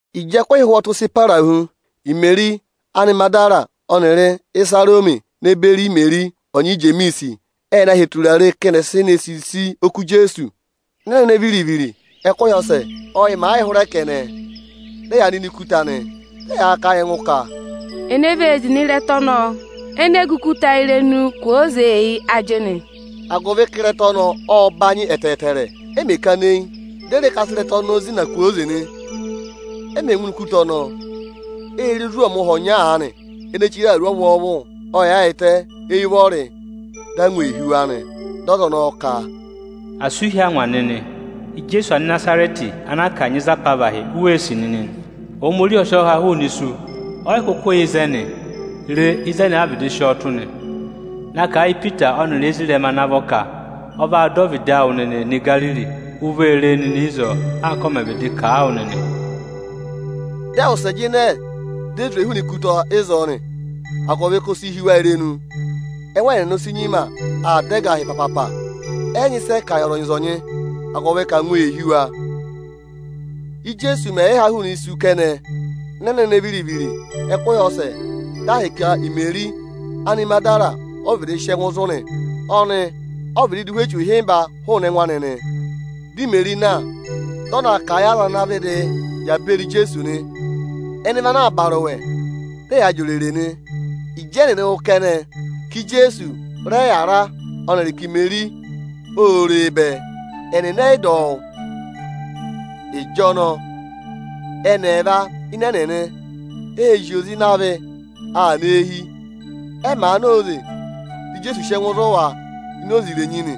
Ịjị ẹkụhị ụhwọtụ sị para hu, Imeri Anịmagịdara ọnịrị Ịsarọmị ne beri Imeri ọnyị Ijemiisi ẹ na hị́ eturare ka ẹnị ẹ̀ sị ne sisi oku Ijeesu. Ịnị ẹnẹnẹ viri-viri ẹkụhị ọsẹ, ọ́ yị màa yịị hụrẹ kẹnẹ, dị ẹ yaa nọ ini ikuta nị. Dị ẹ yaa kà a yị ẹngụ ka, “Ene vee zina ịrẹta ọnọọ ene gù ikuta irenu kwooze yị ajịnị?” Agụvị ka ịrẹta ọnọọ ộ banyị ẹtẹẹtẹrẹ. Ẹ mẹ̀ kana eyi, di e re ka a sị ịrẹta ọnọọ zịna kwooze nị. Ẹ mẹ̀ ngụ ini ikuta ọnọọ, ê re ozwọọmụha ọnya aanị ene chire awuru ọvwọọvụ, ộ yaayịtẹ éyi ụvọrị. Dị angwa ee hí wa nị. Dị ọza ọnọọ ka, “Asị ụ hí angwa nịnị! Ijeesu Anịnazarẹtị ana a kanyị za apavahị u wee sì nịnị nị. Ohomorihi ọ sị ọọ ha hụụnị isu, ọ yị kụkụ yà ịzẹnị. Re, ịzẹnị ẹ vịdị sị ọọ tụ́ nị.” Na kà a yị Ipita ọnịrị ezirẹma anị ana vọ ka, “Ọ vaa dọ ọvịdị awụ nịnịị nọ Igariri. U vee re e nịnị ịzọọ anka ọ mẹ̀ vịdị kà a wụ nịnị.” Dị ẹ wụsẹ jịnẹ, di e zwe hụụnị ikuta ịzọọ nị, agụvị ka o si hí wa irenu, ẹngụ ẹnịnị o si nyima aa dá ẹgahị papapa. Ẹ yị nyị ịsị ẹ kà yị ọzọnyị-ọzọnyị, agụvị ka angwa ee hí wa. [Íjeesu mẹ̀ yị ha hụụnị isu kẹnẹ ịnị ẹnẹnẹ viri-viri ẹkụhị ọsẹ, dị ahịka Imeri Anịmagịdara ọ vịdị sị ẹngụ zụ̀ nị; ọnị ọ vịdị dụ ụhwẹ echu ịhịmba hụụnị ẹngụ anị nị. Dị Imeri na, dị ọ na kà a yị aza anaā vịdịị yà beri Ijeesu nị. Ẹnị vị ana aa ba arụwẹ, dị ẹyaa jị òrèrè nị. Ịjị ẹnịnị wụ́ kẹnẹ ka Ijeesu rẹ yàra ọnịrị ka Imeri ô re e bẹẹ, ẹnịnị ẹ yị dọ wụ́. Ịjọnọọ ẹnị ẹẹva ịnị ẹnịnị ệ zị oze ịnị avị aa nọ eehi. Ẹ màa na óze, dị Ijeesu sị ẹngụ zụ̀ wa ini oze irenyi nị.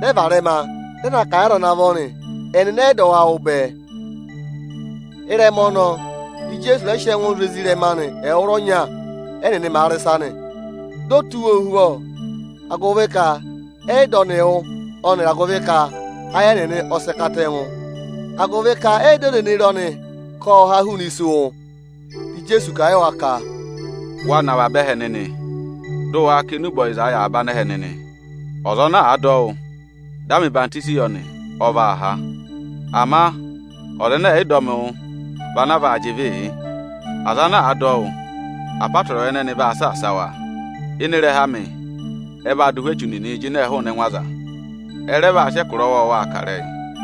Dị ẹ varẹma, dị ẹ na kà a yị aza ana vọ nị. Ẹnịnị ẹ yị dọ wa wụ́ bẹẹ. Ịrẹma ọnọọ, dị Ijeesu rẹ sị ẹngụ zụ̀ ezirẹma anị ẹwụrọnya, ẹ́nịnị màa rị ịsa nị. Ộ tụ́ wa ohuvọ, agụvị ka ẹnịnị ẹ yị dọ ọnị wụ́, ayị ẹnịnị ọ sị katẹngụ, agụvị ka ẹnịnị ẹ yị dọ aza ene re ọnị ka ọnị ộ ha hụụnị isu wụ́. Dị Ijeesu kà a yị wa ka, “Waa nọ avaba ẹhẹ nịnị, dị ụ waa kà enube ọyịza yị avaba anẹhẹ nịnị. Ọza ana àa dọ wụ́, dị a mẹ̀ ọyịhwọzenyi yọ nị, ọ vaa há. Ama ọza ẹnẹ ẹ̀ yị dọ wụ vị ana a vaa jị ịvịị yị. Aza ana àa dọ wụ́, apọtẹrẹwa ẹnẹnị vaa saasa wa: Ịnị ịrẹha amị ẹ vaa dụ ụhwẹ echu nịnị jịnẹ hụụnị ẹngụ aza. Ẹ rẹ vaa sị ẹkụra ọwọọwaa kà ịrẹyị.